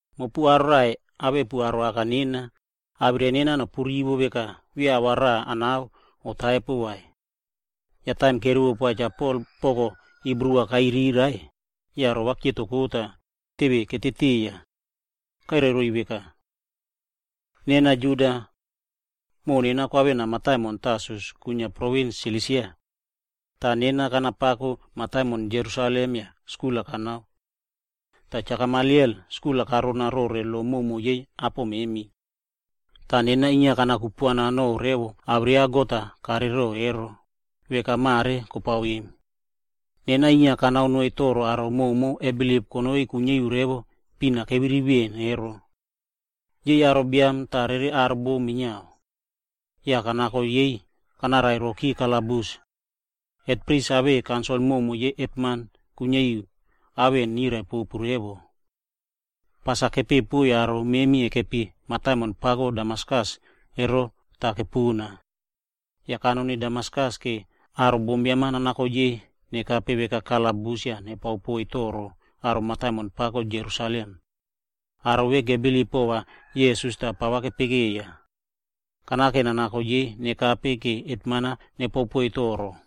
“Mopu aro raꞌai awepu aro aka nena, awirai nena nopu rivo veka beya ava rava kanao kotaipo vai.” Yah taim kerivo poa Cha Pol ava kairai roiy poko Hibru, yah rova kepikimki tah teve keteteiya. Kairai roiy veka, “Nena Juda. Moꞌo nena kwavena mataimon Tarsus kwinia provins Silisia. Toh kanapako mataimon pako Jerusalem yah skul-a kanao mataimon vemona. Yah Cha Gamaliel skul-a karao rona revo rore lo prumo yei apo memi. Yah nena inia kana kupuana no revo awirai ya God-a karerero ero, veka mare kopao emo. Nena inia kanao noiy toro aro prumo kebilip konoi kuiniari revo pina keviri veꞌen emo. Aro biam tah aro bom minia. Yah kanako yei kanarairoki kalabus. Hetpris awei kaunsil koka yei hetman kuiniari nirai popu revo rore ao vemona. Tah pas-a kepeꞌe pona yah kanako kanoni noiy aro memi kekepi mataimon Damaskus. Yah kanaute kanoni Damaskus, vora aro bombiam-a nanako yei nakane veka aro kalabus yah va nepao poiy toro mataimon pako Jerusalem. Aro vemona kebilip pova Jisas tah pava kepekeiya. Kanao nanako yei nakane va hetman-a nepao poiy toro.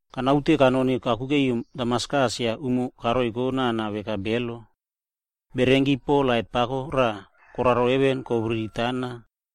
“Kanaute kanoni kakuke ri mataimon Damaskus yah umo karoiko nana veka belo. Yah kope bererenki lait pako raꞌa koraro heven tah kobiriri kotoporeri tana.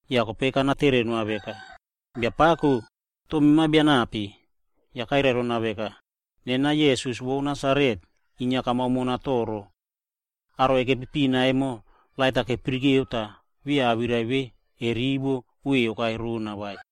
“Kope kanatere noa veka, ‘Biapako, toh mema nape?’ Kope kairai rona veka, ‘Nena Jisas vo Nasaret, mema inia kamao mona toro.’ Aro vemona kekepi pina emo lait-a kepirikeu, toh beya awirai vemona kwei kokai rona emo kerivo vai.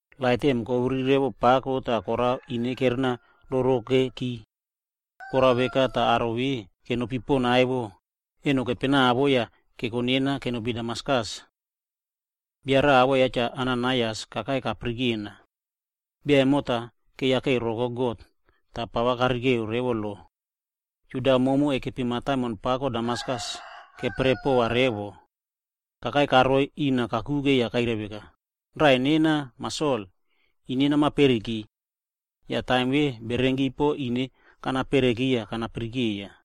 Lait vemona kobiriri pako tah korao ine kerenarorokeki. Korao veka tah aro vemona kenopi pona emo, eno kepenavo yah keko nena kenopi mataimon pako Damaskus. “Bia raꞌa awoꞌo ya Cha Ananaias kakai nayarana. Bia emo ya keyakeiroko God, tah pava karekeu revo lo. Yah aro Juda koka kekepi mataimon pako Damaskus emo keperepova revo. Kakai karoi rina kakuke tah kairai rona veka, ‘Raꞌai nena Mah Sol, ine nama periki.’ Yah taim vemona, bererenki ine kerenaperiki yah kanayaraka.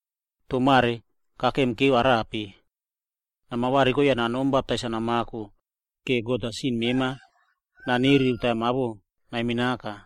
Toh mare kakemikekeu arape? Nama variko yah nanom baptais-a namako, yah God-a va sin mema naniriki taim awoꞌo ya naminaka.’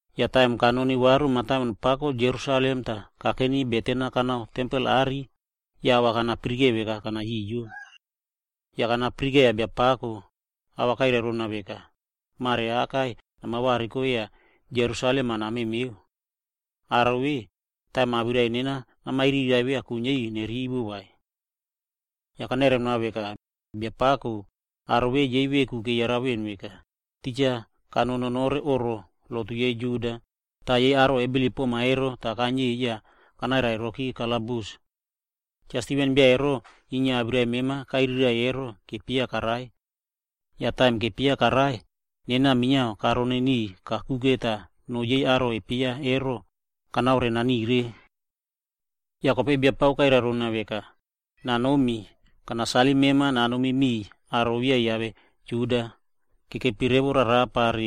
“Yah taim kanoni varu mataimon pako Jerusalem tah kakeni beten-a kanao tempel are, yah ava kanapirike veka kana yoyo. Yah kanapirikeiya Biapako, ava kairai rona veka, ‘Mare akai nama variko yah namemeu Jerusalem. Aro vemona, taim awirai nena namairiraiꞌvo, beya kuiniari nerivo vai.’ “Yah kanairai noa veka, ‘Biapako, aro vemona yei veku keyarana veꞌen veka, titja kanoni nonore oꞌro lotu yei Juda tah aro kebilip poma ero, kaniey yah kanarairoki kalabus. Cha Stiven bia ya awirai mema kairiraiꞌvo, yah kepieya karai. Yah taim kepieya karai, nena minia karoni niꞌiy kakuke tah no yei aro vemona kepieya emo, kanaore nanire.’ “Yah kope Biapako kairai rona veka, ‘Nanomi, nena va nanasalim mema nanomi miꞌiy aro beya kiave Juda kekepi revo rarapa.’”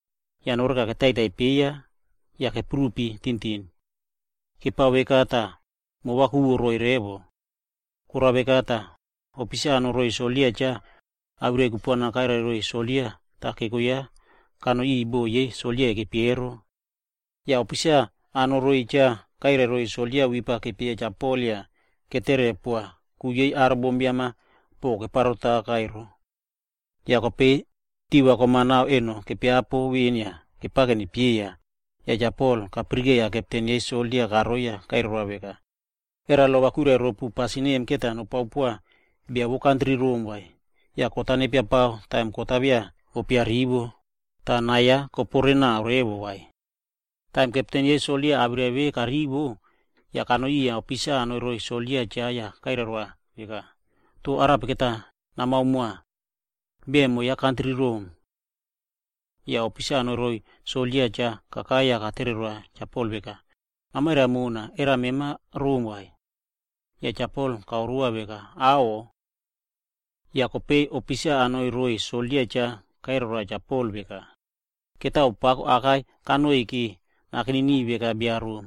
Yah noreka va ketaitai peiy tah keprupi tintin. Kepao veka tah umoi-a kokeikei roiy poaka. Korao veka tah, ofisa kanoi roiy soldia cha ero, awirai kupuana kairai roiy soldia tah keko ya Cha Pol kanoi bo yei kekepi ero. Yah ofisa kanoi cha emo, kairai roiy soldia va wip-a nepieya Cha Pol yah netere poa, ku vo aro bombiam-a ereva kepukeya ero. Kope taim kom-a re eno tiva kepiapo veꞌen yah kepao nepieya, tah Cha Pol kayaraka kepten yei soldia karoi yah kairai roa veka, “Era lo va kwirai ropu va pasin vemona nopao poa bia vo kantri Rom, yah kot-a nepiapao taim kot ya beya kopurivo, Kope taim kepten yei soldia awirai vemona karivo, yah kanoi riya ofisa kanoi roiy soldia va cha ero tah kairai roa veka, “Toh va arape namao moa? Bia emo ya kantri Rom.” Yah kope ofisa kanoi roiy soldia va cha ero kakai yah katere roa Cha Pol veka, “Namairai mona, era mema bia Rom vai?” Yah Cha Pol kairai roa veka, “Aꞌho.” Yah kope ofisa kanoi roiy soldia cha ero kairai roa Cha Pol veka, “Mani pako aka kanoiy vora nakeni niꞌiy veka bia ya Rom.”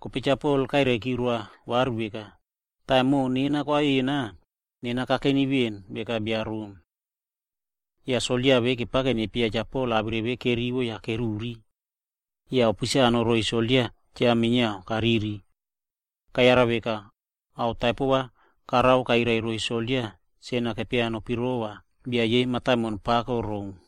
Kope Cha Pol kairai roa veka, “Nena beya mani kanoiy vai. Taim moꞌo nena kwavena, nena kakeni veꞌen veka bia yei aro Rom.” Yah soldia vemo kepao nepieya Cha Pol yah taim awirai vemona kerivo, yah keturepiki. Yah ofisa kanoi roiy soldia va cha ero kariri. Ku vo korao veka, kayara veka ao taipo karao, kairai roiy soldia sen-a kenopirova bia vo mataimon pako Rom.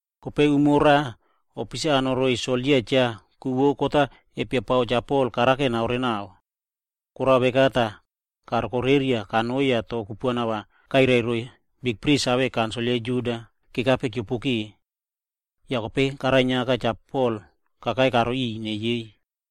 Kope umo raꞌa, ofisa kanoi roiy soldia va cha ero, karao ku kot-a kepiapao Cha Pol ero naorenao. Korao veka tah, karokoreriaki Cha Pol kanoi yah awirai kupuana kairai roiy bikpris awei kaunsil yei Juda kekape keopoke. Yah kope karainiaka Cha Pol kakai karoiy riꞌiy revo ine yei.